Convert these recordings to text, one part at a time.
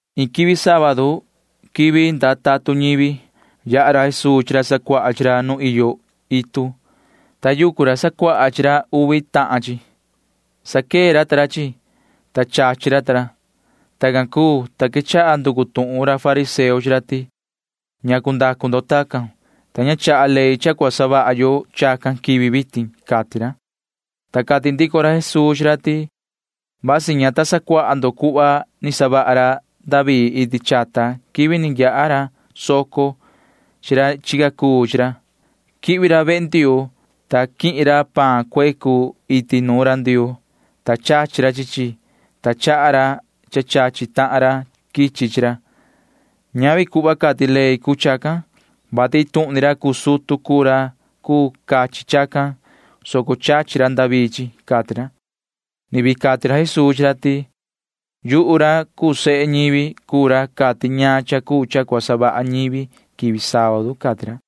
Iin quivi sábadu [quivi ndaa tatun ñivi] yaha ra Jesuu chi ra sacuaha chi ra nu iyo itu, ta yucu ra sacuaha chi ra uvi tahan chi. Saquee ra chi chi, ta chachi ra. Tacan cuu, ta quechaha nducu tuhun ra fariseo chi ra ti: ―¿Ñacu ndacu ndo chacan, vati ña chaha ley cha cua savaha yo chacan quivi vitin? ―cati ra. Ta cati ndico ra Jesuu chi ra ti: ―Vasi ña ta sacuaha ndo cuhva ni savaha ra David iti chata quivi ni yaha soco chi ra chi ra chica chi ra. Quihvi ra vehe Ndioo, ta quihin ra paan cuecu iti nuun ra Ndioo, ta chachi ra chi chi, ta chaha ra cha cachi tahan ra quichi chi ra. Ñavi cuhva cati ley cuu chacan, vati iin tuhun ni ra cuu sutu cuu ra cuu cachi chacan, soco chachi ra David ta ra ―cati ra. Ni vii cati ra Jesuu chi ra ti: ―Yuhu ra cuu sehe ñivi cuu ra cati ñaan cha cuu cha cua savaha ñivi quivi sábadu ―cati ra.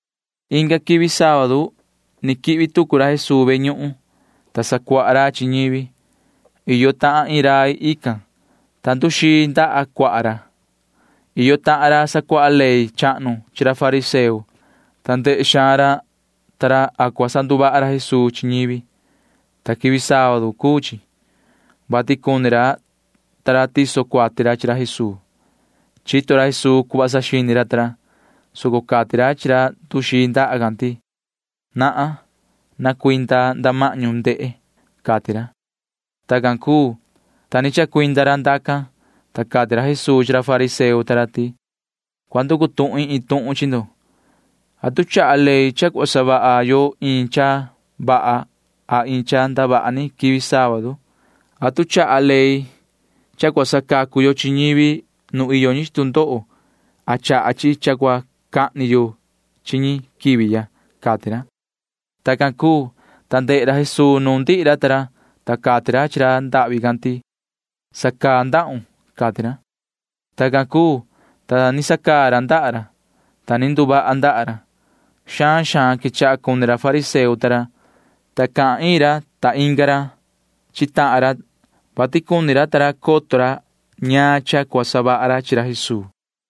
Inga quivi sábadu ni quihvi tucu ra Jesuu ve ñuhun, ta sacuaha ra chi ñivi. Iyo tahan iin rai tican, ta nduxii ndaha cuaha ra. Iyo tahan ra sacuaha ley chahnu chi ra fariseo, ta ndehe xaan ra ta ra a cua sanduvaha ra Jesuu chi ñivi, ta quivi sábadu cuu chi, vati cuni ra ta ra tiso ra cuati ra Jesuu. Chito ra Jesuu cuhva saxini ra ta ra, soco cati ra chi ra nduxii ndaha ti: ―Nahan. Na cuinda nda mahñu na ndehe ―cati ra. Tacan cuu, ta ni chacuinda ra ndacan, ta cati ra Jesuu chi ra fariseo ta ra ti: ―Cua nducu tuhin iin tuhun chi ndo. ¿Atu chaha ley cha cua savaha yo iin cha vaha a iin cha ndavaha ni quivi sábadu? ¿Atu chaha ley cha cua sacacu yo chi ñivi nu iyo ñi chi tu ndoho a chaha chi cha cua cahni yo chi ñi quivi ya? ―cati ra. Tacan cuu, ta ndehe ra Jesuu nuun ndihi ra ta ra, ta cati ra chi ra ndahvi can ti: ―Sacaun ndahun ―cati ra. Tacan cuu, ta ni sacaa ra ndaha ra, ta ni nduvaha ndaha ra. Xaan xaan quechaha cuni ra fariseo ta ra, ta cahan ra iin ra inga ra chi tahan ra, vati cuni ra coto ra ñaan cha cuu cha cua savaha ra chi ra Jesuu.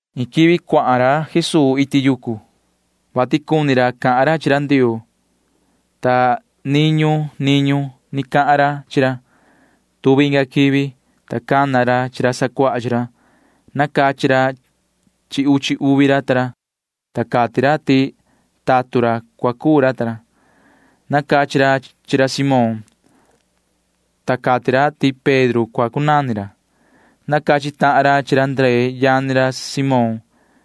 Iin quivi can cuahan ra Jesuu iti yucu, vati cuni ra cahan ra chi ra Ndioo, ta niñu niñu ni cahan ra chi ra. Tuvi inga quivi, ta cana ra chi ra sacuaha chi ra. Nacachi ra uchi uvi ra, ta cati ra ti tatun ra cua cuu ra ta ra. Nacachi ra chi ra Simón, ta cati ra ti Pedro cua cunani ra. Nacachi tahan ra chi ra Ndree yani ra Simón,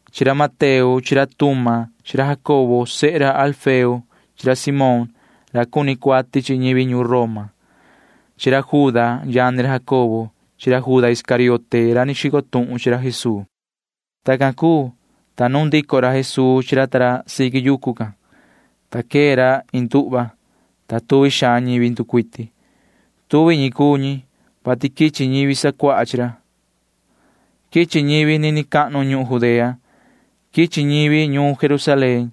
chi ra Mateo chi ra Tuma chi ra Jacobo sehe Alfeo chi ra Simón ra cuni cuati chi ñivi ñuun Roma chi ra Juda yani ra Jacobo chi ra Juda Iscariote ra cua xico tuhun chi ra Jesuu. Tacan cuu, ta nuun ndico ra Jesuu chi ra ta ra siqui yucu can, ta queta ra iin nduhva, ta tuvi xaan ñivi nducuiti. Tuvi ñi cuu ñi, vati quichi ñivi sacuaha chi ra. Quichi ñivi nini cahnu ñuhun Judea. Quichi ñi ñuun Jerusalén.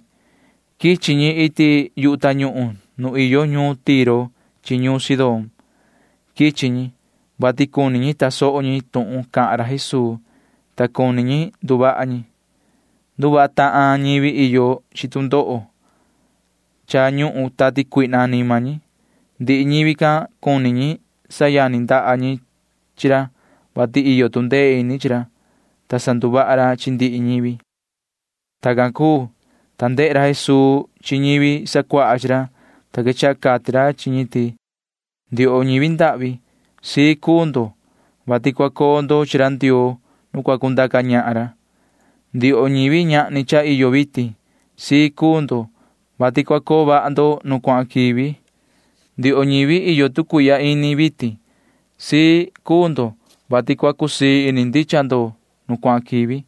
Quichi ñi iti yu tañuhun nu iyo ñuun Tiro chi ñuun Sidón. Quichi ñi, vati cuni ñi tasoho ñi tuhun cahan ra Jesuu, ta cuni ñi nduvaha ñi. Nduvaha tahan ñivi iyo chi tu ndoho cha ñuhun tati cuihna anima ñi. Ndihi ñivi can cuni ñi sayani ndaha ñi chi ra, vati iyo tu ndee ini chi ra, ta sanduvaha ra chi ndihi ñivi. Tacan cuu, ta ndehe ra Jesuu chi ñivi sacuaha chi ra, ta quechaha cati ra chi ñi ti: ―Ndioho ñivi ndahvi, na cua cusii ini ndo, vati cua coo ndo chi ra Ndioo nu cua cundaca ñahan ra. ’Ndioho ñivi ñahni cha iyo vitin, na cua cusii ini ndo, vati cua coo vaha ndo nu cuahan quivi. ’Ndioho ñivi iyo tu cuihya ini vitin, na cua cusii ini ndo, vati cua cusii ndicha ini ndo nu cuahan quivi.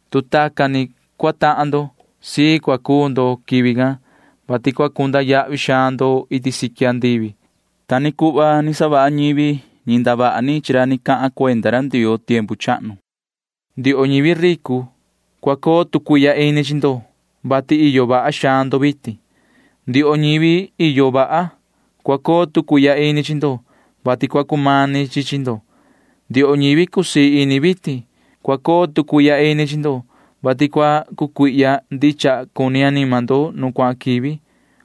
Tu tacan ni cua tahan ndo, na cua cusii ini ndo quivi can, vati vaha xaan cua cunda yahvi ndo iti siqui andivi. Ta ni cuhva cha ni savaha ñivi ñi ndavaha ni chi ra ni cahan cuenda ra Ndioo tiempu chahnu. ’Ndioho ñivi ricu, cua coo tu cuihya ini chi ndo, vati iyo vaha ndo vitin. ’Ndioho ñivi iyo vaha, cua coo tu cuihya ini chi ndo, vati cua cumani chi chi ndo. ’Ndioho ñivi cusii ini vitin, cua coo tu cuihya ini chi ndo, vati cua cucuihya ndicha cuni anima ndo nu cuahan quivi.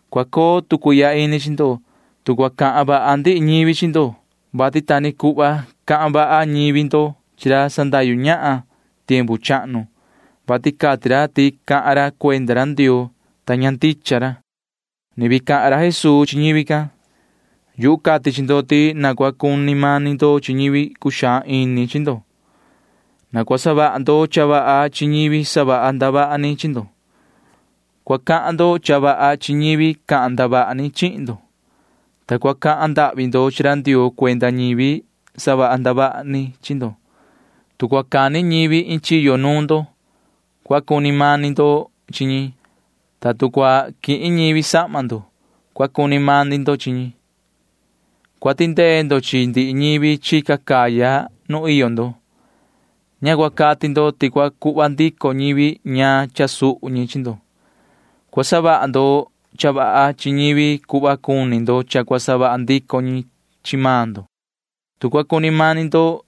’Cua coo tu cuihya ini chi ndo, tu cua cahan vaha ndihi ñivi chi ndo, vati ta ni cuhva cahan vaha ñivi ndo chi ra sandahyu ñahan tiempu chahnu, vati cati ra ti cahan ra cuenda ra Ndioo, ta ña ndicha ra. [Ni vii cahan ra Jesuu chi ñivi can:] ’Yuhu cati chi ndo ti na cua cuni mani ndo chi ñivi cuxaan ini chi ndo. Na cua savaha ndo cha vaha chi ñivi savaha ndavaha ni chi ndo. Cua cahan ndo cha vaha chi ñivi cahan ndavaha ni chihin ndo, ta cua cahan ndahvi ndo chi ra Ndioo cuenda ñivi savaha ndavaha ni chi ndo. Tu cua cani ñivi iin chiyo nuun ndo, cua cuni mani ndo chi ñi, ta tu cua quihin ñivi sahma ndo, cua cuni mani ndo chi ñi. Cua tindee ndo chi ndihi ñivi chica caya nu iyo ndo. Ña cua cati ndo ti cua cuhva ndico ñivi ñaan cha suhu ñi chi ndo. Cua savaha ndo cha vaha chi ñivi cuhva cuni ndo cha cua savaha ndico ñi chi maan ndo. ’Tu cua cuni mani ndo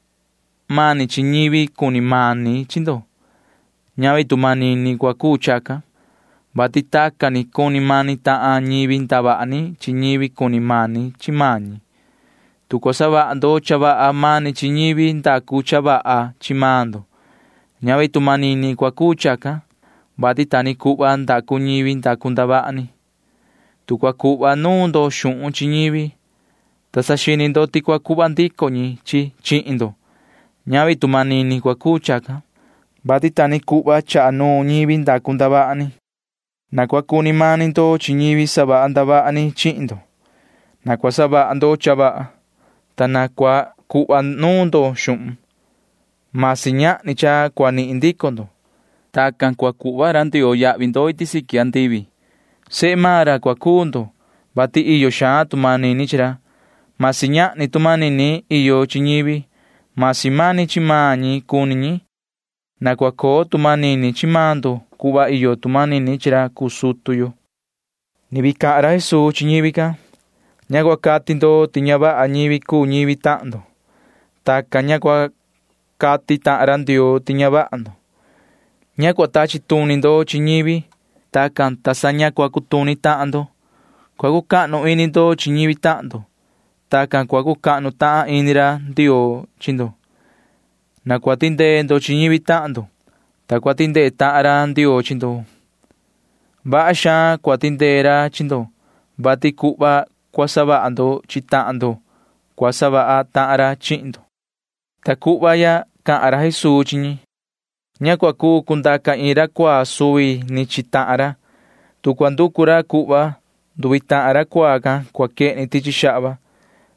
mani chi ñivi cuni mani chi maan ndo, ñavi tu manini cua cuu chacan, vati tacan ni cuni mani tahan ñivi ndavaha ni chi ñivi cuni mani chi maan ñi. Tu cua savaha ndo cha vaha mani chi ñivi ndacu cha vaha chi maan ndo, ñavi tu manini cua cuu chacan, vati ta ni cuhva ndacu ñivi ndacu ndavaha ni. Tu cua cuhva nuun ndo xuhun chi ñivi, ta saxini ndo ti cua cuhva ndico ñi chi maan ndo, ñavi tu manini cua cuu chacan, vati ta ni cuhva chaha nuun ñivi ndacu ndavaha ni. Na cua cuni mani ndo chi ñivi savaha ndavaha ni chihin ndo. Na cua savaha ndo cha vaha, ta na cua cuhva nuun ndo xuhun―masi ñahni cha cua nihin ndico ndo. Tacan, ta sa cua savaha vaha xaan ra Ndioo chi ndo iti siqui andivi. Sehe maan ra cua cuu ndo, vati iyo xaan tu manini chi ra―masi ñahni tu manini iyo chi ñivi, masi mani chi maan ñi cuni ñi. Na cua coo tu manini chi maan ndo cuhva iyo tu manini chi ra cuu sutu yo. [Ni vii cahan ra Jesuu chi ñivi can:] ’Ña cua cati ndo ti ña vaha ñivi cuu ñivi tahan ndo. Tacan, ta sa cua cati tahan ra Ndioo ti ña vaha maan ndo. Ña cua tachi tuni ndo chi ñivi. Tacan, ta sa ña cua cutuni maan ndo. Cua cucahnu ini ndo chi ñivi tahan ndo, ta sa cua cucahnu tahan ini ra Ndioo chi maan ndo. Na cua tindee ndo chi ñivi tahan ndo, ta sa cua tindee tahan ra Ndioo chi maan ndo. Vaha xaan cua tindee ra chi ndo, vati cuhva cua savaha ndo chi tahan ndo cua savaha tahan ra chi maan ndo. Ta cuhva ya cahan ra Jesuu chi ñi: ―Ña cua cuu cundaca iin ra cuaa chi suvi ni tahan maan ra. Tu cua nducu ra cuhva, nduvi tahan ra cuaa can cua quehni tichi xahva.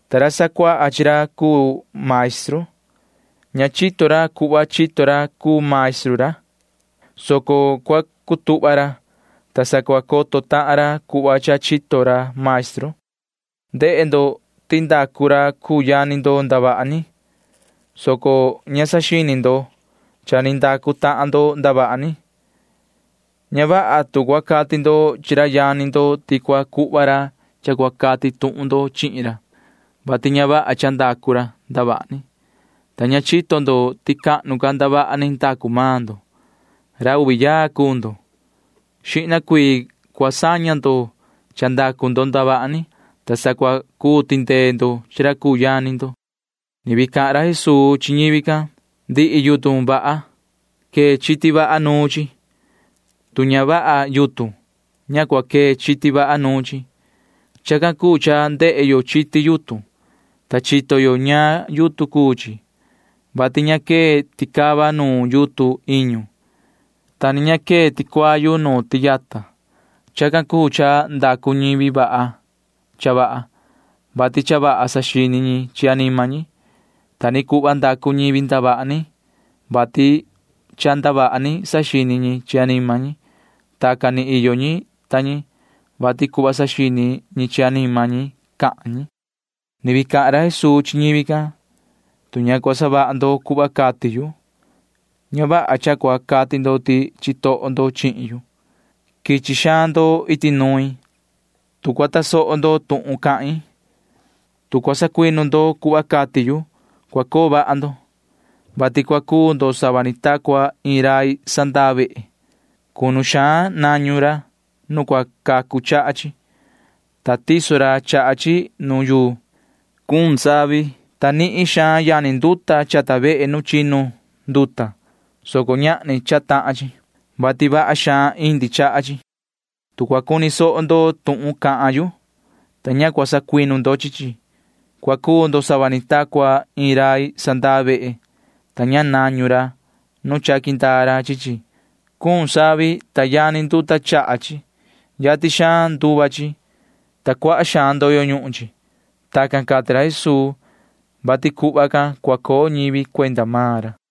Ta ra sacuaha chi ra cuu maestru―ña chito ra cuhva chito ra cuu maestru ra, soco cua cutuhva ra, ta sa cua coto tahan ra cuhva cha chito ra maestru. ’Ndehe ndo ti ndacu ra cuu yani ndo ndavaha ni, soco ña saxini ndo cha ni ndacu tahan maan ndo ndavaha ni. Ña vaha tu cua cati ndo chi ra yani ndo ti cua cuhva ra cha cua cati tuhun ndo chihin ra, vati ña vaha cha ndacu ndo ndavaha ni, ta ña chito ndo ti cahnu ca ndavaha ni ndacu maan ndo. Ra uvi yaa cuu ndo. Xihna ca cua saña ndo cha ndacu maan ndo ndavaha ni, ta sa cua cuu tindee ndo chi ra cuu yani ndo. [Ni vii cahan ra Jesuu chi ñivi can:] ’Ndihi yutun vaha―quee chiti vaha nuun chi. Tu ña vaha yutun, ña cua quee chiti vaha nuun chi. Chacan cuu cha ndehe yo chiti yutun, ta chito yo ñaan yutun cuu chi, vati ña quee ticava nu yutun iñu, ta ni ña quee ticuayu nu tiyata. Chacan cuu cha ndacu ñivi vaha cha vaha, vati cha vaha saxini ñi chi anima ñi. Ta ni cuhva ndavaha ni ndacu ñivi ndavaha ni, vati cha ndavaha ni saxini ñi chi anima ñi. Tacan ni iyo ñi ta ñi, vati cuhva saxini ñi chi anima ñi cahan ñi. [Ni vii cahan ra Jesuu chi ñivi can:] ’Tu ña cua savaha ndo cuhva cati yu, ña vaha cha cua cati ndo ti chitoho ndo chihin yu. Quichi xaan ndo iti nuin. Tu cua tasoho ndo tuhun cahin, tu cua sacuinu ndo cuhva cati yu, cua coo vaha ndo, vati cua cuu ndo sava ni ta cua iin rai sandaa vehe. Cunu vaha nañu ra nu cua cacu chaha chi, ta tiso ra chaha chi nu yuu. Cuun savi, ta nihin xaan yani nduta chaha vehe nu chinu nduta, soco ñahni cha tahan chi, vati vaha xaan indi chaha chi. Tu cua cuni soho ndo tuhun cahan yu, ta ña cua sacuinu ndo chi chi, cua cuu ndo sava ni ta cua iin rai sandaa vehe, ta ña nañu ra nu chaqui ndaa ra chi chi. Cuun savi, ta yani nduta chaha chi. Yatin xaan nduva chi, ta cuaha xaan ndoyo ñuhun chi. [Tacan cati ra Jesuu, vati cuhva cua coo ñivi cuenda maan ra cuu chi.]